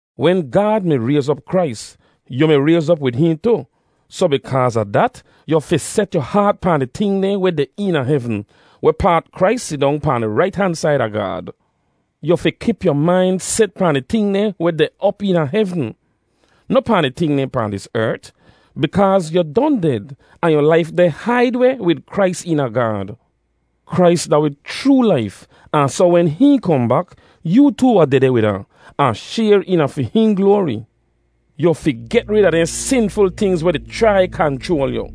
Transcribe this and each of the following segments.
Wen Gaad mi rayz op Krais, yu mi rayz op wid hihn tu; soh bikaaz a dat, yu fi set yu haat pahn di ting dehn weh deh eena hevn, wehpaat Krais sidong pahn di rait han said a Gaad. Yu fi kip yu main set pahn di ting dehn weh deh op eena hevn, noh pahn di ting dehn pahn dis ert; bikaaz yu don ded, ahn yu laif deh haid weh wid Krais eena Gaad. Krais da wi chroo laif, ahn soh wen hihn kohn bak, yoo tu wahn dehdeh wid ahn, ahn shayr eena fi hihn gloari. Yu fi get rid a dehn sinful tingz weh di chrai kanchroal yu.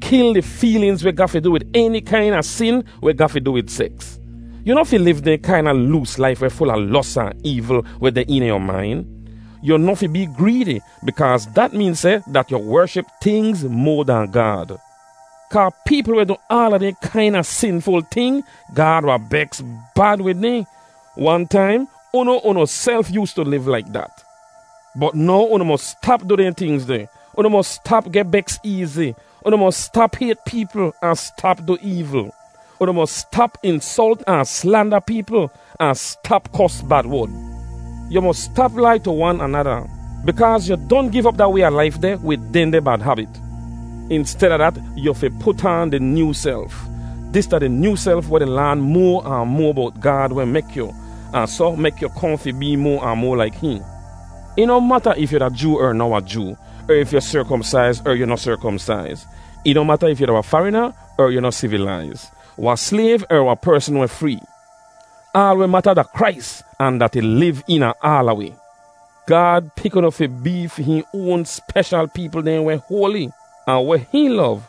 Kil di feelinz weh ga fi du wid eni kaina sin weh ga fi du wid seks. Yu noh fi liv dehn kaina loos laif weh ful a los ahn eevl weh deh eena yu main. Yu noh fi bee greedi bikaaz dat meen seh dat yu wership tingz moa dahn Gaad. Kaa peepl weh du aala dehn kaina sinful ting, Gaad wahn beks bad wid dehn. Wan taim, unu unuself yoostu liv laik dat. Bot now unu mos stap du dehn tingz deh. Unu mos stap geh beks eezi. Unu mos stap hayt peepl an stap du eevl. Unu mos stap insolt ahn slanda peepl ahn stap kos bad wod. Yu mos stap lai tu wan anada bikaaz yu don giv op da way a laif deh wid dehndeh bad habit. Insteda dat, yu fi put aan di nyoo self. Dis da di nyoo self weh di laan moa ahn moa bowt Gaad weh mek yu, ahn soh mek yu kohn fi bee moa ahn moa laik hihn. Ih noh mata if yu da Joo er noh wahn Joo, er if yu serkomsaiz er yu noh serkomsaiz. Ih noh mata if yu da wahn farina er yu noh sivilaiz, wahn slayv er wahn persn weh free. Aal weh mata da Krais ahn dat ih liv eena aala wi. Gaad pik unu fi bee fi hihn oan speshal peepl dehn weh hoali, ahn weh hihn lov,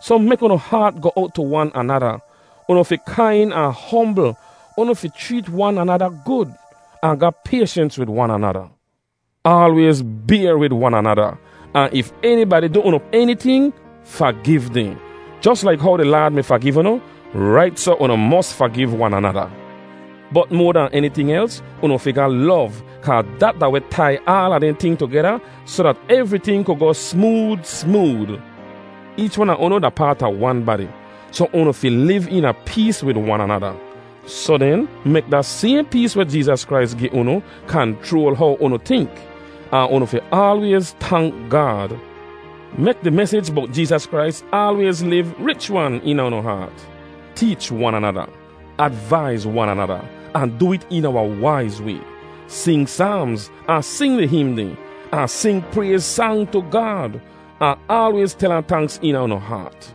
soh mek unu haat goh owt tu wan anada; unu fi kain ahn hombl, unu fi chreet wan anada gud, ahn ga payshens wid wan anada. Aalwayz bayr wid wan anada, ahn if enibadi du unu eniting, fagiv dehn; jos laik how di Laad mi fagiv unu, rait soh unu mos fagiv wan anada. Bot moa dahn eniting els, unu fi ga lov kaa dat da weh tai aala dehn ting tugeda soh dat evriting ku goh smood smood. Eech wan a unu da paat a wan badi, soh unu fi liv eena pees wid wan anada. Soh den, mek da sayhn pees weh Jeezas Krais gi unu kanchroal how unu tink. Ahn unu fi aalwayz tank Gaad. Mek di mesij bowt Jeezas Krais aalwayz liv rich-wan eena unu haat; teech wan anada, advaiz wan anada, ahn du it eena wahn waiz way. Sing saamz, ahn sing di him dehn, ahn sing prayz sang tu Gaad, ahn aalwayz tel ahn tanks eena unu haat.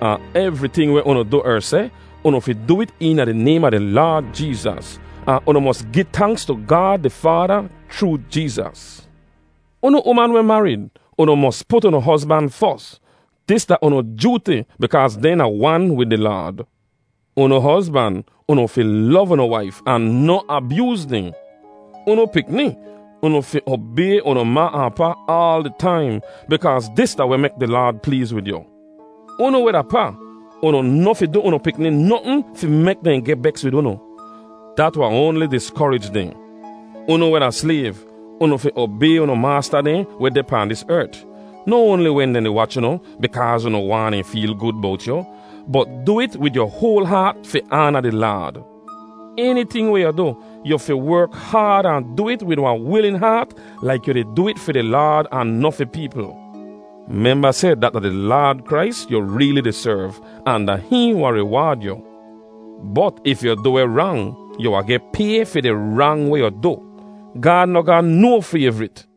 Ahn evriting weh unu du er seh, unu fi du it eena di naym a di Laad Jeezas, ahn unu mos gi tanks tu Gaad di Faada chroo Jeezas. Unu uman weh marid, unu mos put unu hozban fos. Dis da unu jooti bikaaz dehn da wan wid di Laad. Unu hozban, unu fi lov unu waif ahn noh abyooz dehn. Unu pikni, unu fi obay unu ma ahn pa aal di taim bikaaz dis da weh mek di Laad pleez wid yu. Unu weh da pa, unu noh fi du unu pikni notn fi mek dehn geh beks wid unu; dat wahn oanli diskorij dehn. Unu weh da slayv, unu fi obay unu maasta dehn weh deh pahn dis ert, noh oanli wen dehn di wach unu bikaaz unu waahn dehn feel gud bowt yu, bot du it wid yu hoal haat fi aana di Laad. Eniting weh yu du, yu fi werk haad ahn du it wid wahn wilin haat laik yu di du it fi di Laad ahn noh fi peepl. Memba seh dat da di Laad Krais yu reeli di serv ahn da hihn wahn riwaad yu. Bot if yu du weh rang, yu wahn geh pay fi di rang weh yu du. Gaad noh ga no fayvrit.